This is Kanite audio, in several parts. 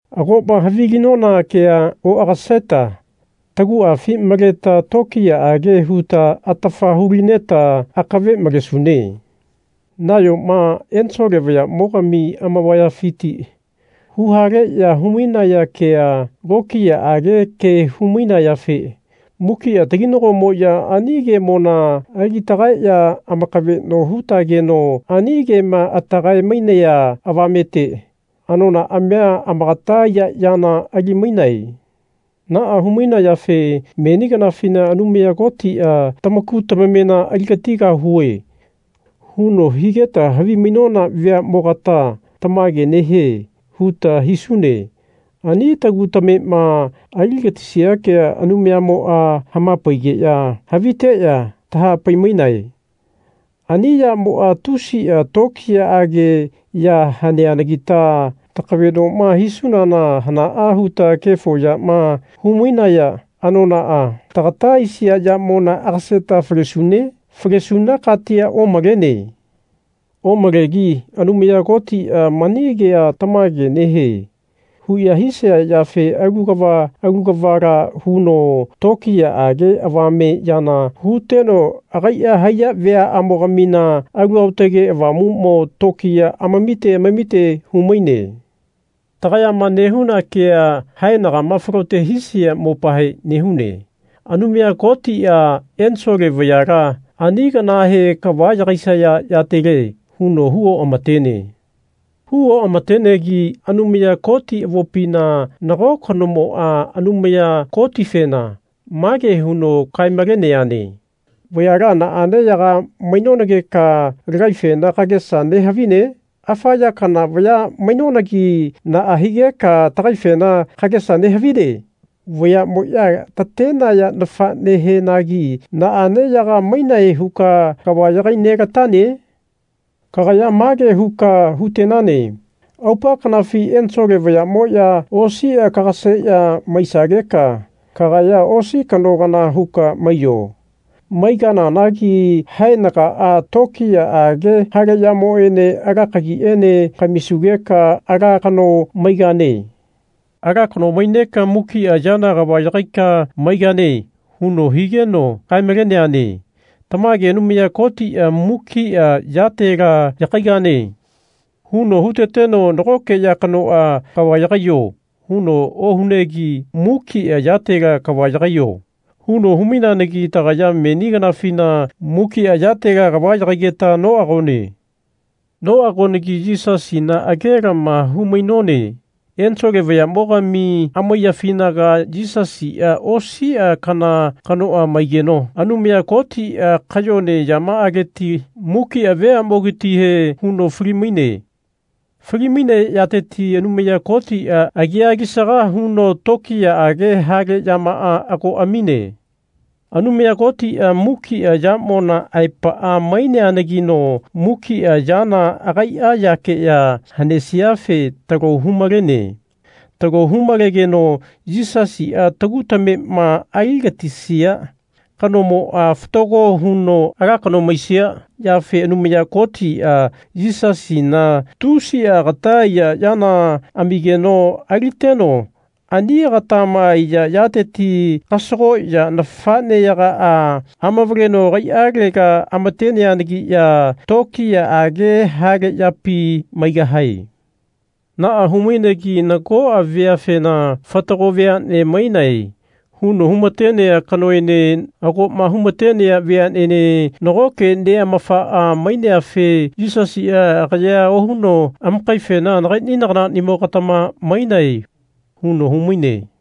Agoma havilinona kea oagaseta taguafi maleta tokiyaage huta atafa hulineta akave malesune. Nayoma ensole vayamo-gami amavayafiti huhaleya hu-mainaya kea lokiyaage ke hu-mainayafe mukia taginagomoya ani kemona ali tagaeya amakaveno hutageno ani kema atagae-mainaya avamete anonaamia amakata aiya yana ali-mainae. Naa hu-mainayafe meni kanafina Anumaya Kotia Tamaku tamamena aligatigahue. huno higeta havimainona veamogata Tamage nehie. huta hisune. Ani tagu tamema aligatisia kea Anumayamoa hamapaigeya haviteya tahapai-mainae. Ani yamoa tusia tokiyaage ya haneanagita takavenoma hisunana hanaa huta kefo yama hu-mainaya anonaa, tagata aisia yamona agaseta falesune? Falesuna katia omalene. Omalegi Anumaya Kotia mani kea Tamage nehie. huya hisaya yafe alu kava alu kavala huno tokiyaage avame yana huteno agaia haiya veaamo-gamina Alu Aotage Avamumo tokiya amamite amamite humaine. Tagayama nehuna kea haenagama falote hisia mopahe nehune. Anumaya Kotia ensole vayala ani kanahe Kava yagaisaya yatele. huno hu oamatene. Hu oamatenegi Anumaya Koti avopina nago kanomoa Anumaya Kotifena mage huno kae-maleneane Vayala naane yaga mainonageka lagaifena kagesa nehavine? Afa ya kana vaya mainonagi naa higeka tagaifena kagesa nehavine? Vayamoya tatenaya nafanehenagi naane yaga mainae huka kava yagai nelatane? Kagaya mage huka hutenane Aupa kanafi ensole vayamoya osia kagaseya maisageka kagaya osi kano kana huka maiyo. Maigananagi haenagaa tokiyaage hale yamoene ala kagiene kamisugeka ala kano maigane. Ala kano maineka mukia yana kava yagaika maigane. huno higeno kae-maleneane. Tamage Anumaya Kotia Mukia yatela yagaigane. huno huteteno nagoke ya kanoa Kava yagaiyo. huno ohunegi mukia yatela Kava yagaiyo. huno hu-maineanagi tagaya meni kanafina mukia yatela kava yagaigeta noagone. Noagonagi Yisasina agelama hu-mainone. Ensole vayamogami amaiyafinaga Yisasia osia kana kanoa maigeno Anumaya Kotia kayone yamaaleti mukia veamogatihe huno fali-maine. Fali-mainea yateti Anumaya Kotia agia alisaga huno tokiyaage hale yamaa ago amine. Anumaya Kotia mukia yamona aepaa maineanagino mukia yana agaia yakeya hanesiafe talo humalene. Talo hu-malegeno Yisasia tagu tamema aligatisia kanomoa fatago huno ala kano maisia yafe Anumaya Kotia Yisasina tusia agata aiya yana amigeno aliteno ani agatama aiya yateti kasagoya nafaneyagaa amavaleno agaialega amateneanagiya tokiyaage hale yapi maigahae. Naa hu-mainegi nagoa veafena Fatago veane mainae. huno humatenea kanoene agoma humatenea veanene nagoke neamafaa maineafe Yisasia agayea ohuno amakaifena Nagaini nagananimogatama mainae. huno humaine.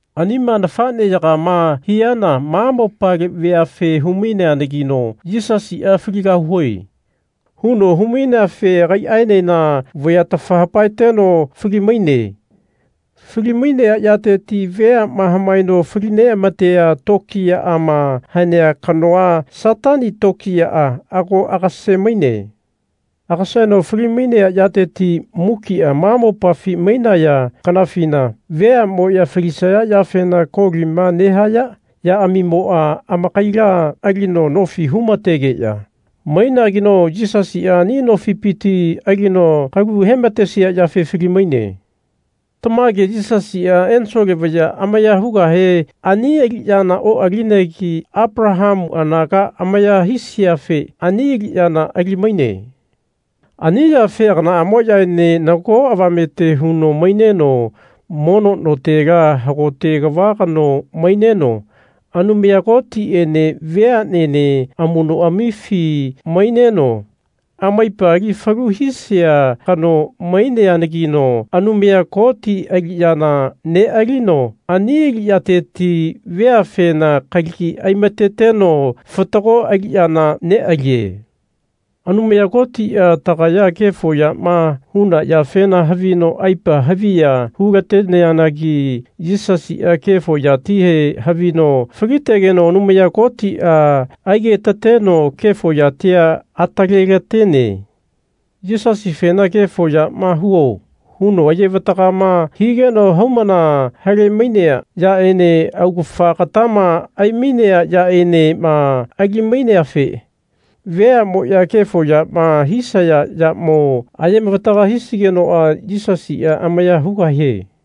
Anima nafaneyagama hiana ma mopale veafe hu-maineanagino Yisasia Faligahue. huno hu-maineafe agaiaenena vayatafa hapaeteno fali-maine. Fali-mainea yateti veama hamaeno fali neamatea tokiyaama hanea kanoa, Satani tokiyaa ago agase-maine. Agaseno fali-mainea yateti mukia ma mopafi mainaya kanafina veamoya falisaya yafena kolima nehaya yaamimoa amakaila alino nofi humategeya mainageno Yisasia ani nofipiti alino kalu hematesia yafe fali-maine. Tamage Yisasia ensole vaya amaya hugahe ani aliyana oalinegi Apalahamu anaga amaya hisiafe ani aliyana ali-maine. Ani yafe aganaamoyaene nago avamete huno maineno mono notela hagote kava kano maineno Anumaya Kotiene veanene amunoamifi maineno amaipa ali falu hisia kano maineanagino Anumaya Koti aliyana nealino ani aliyateti veafena kalagi aimateteno fatago aliyana nealie. Anumaya Kotia tagaya kefo yama huna yafena havino aipa haviya hulateneanagi Yisasia kefo yatihe havino falitegeno Anumaya Kotia aigetateno kefo yatia atalelatene. Yisasifena Kefo yama huo. huno ayevatagama higeno haumana hale-mainea yaene augafa agatama ai-mainea yaenema ali-maineafe veamoya kefo yama hisaya yamo aye-mavataga hisigenoa Yisasia amaya hugahie.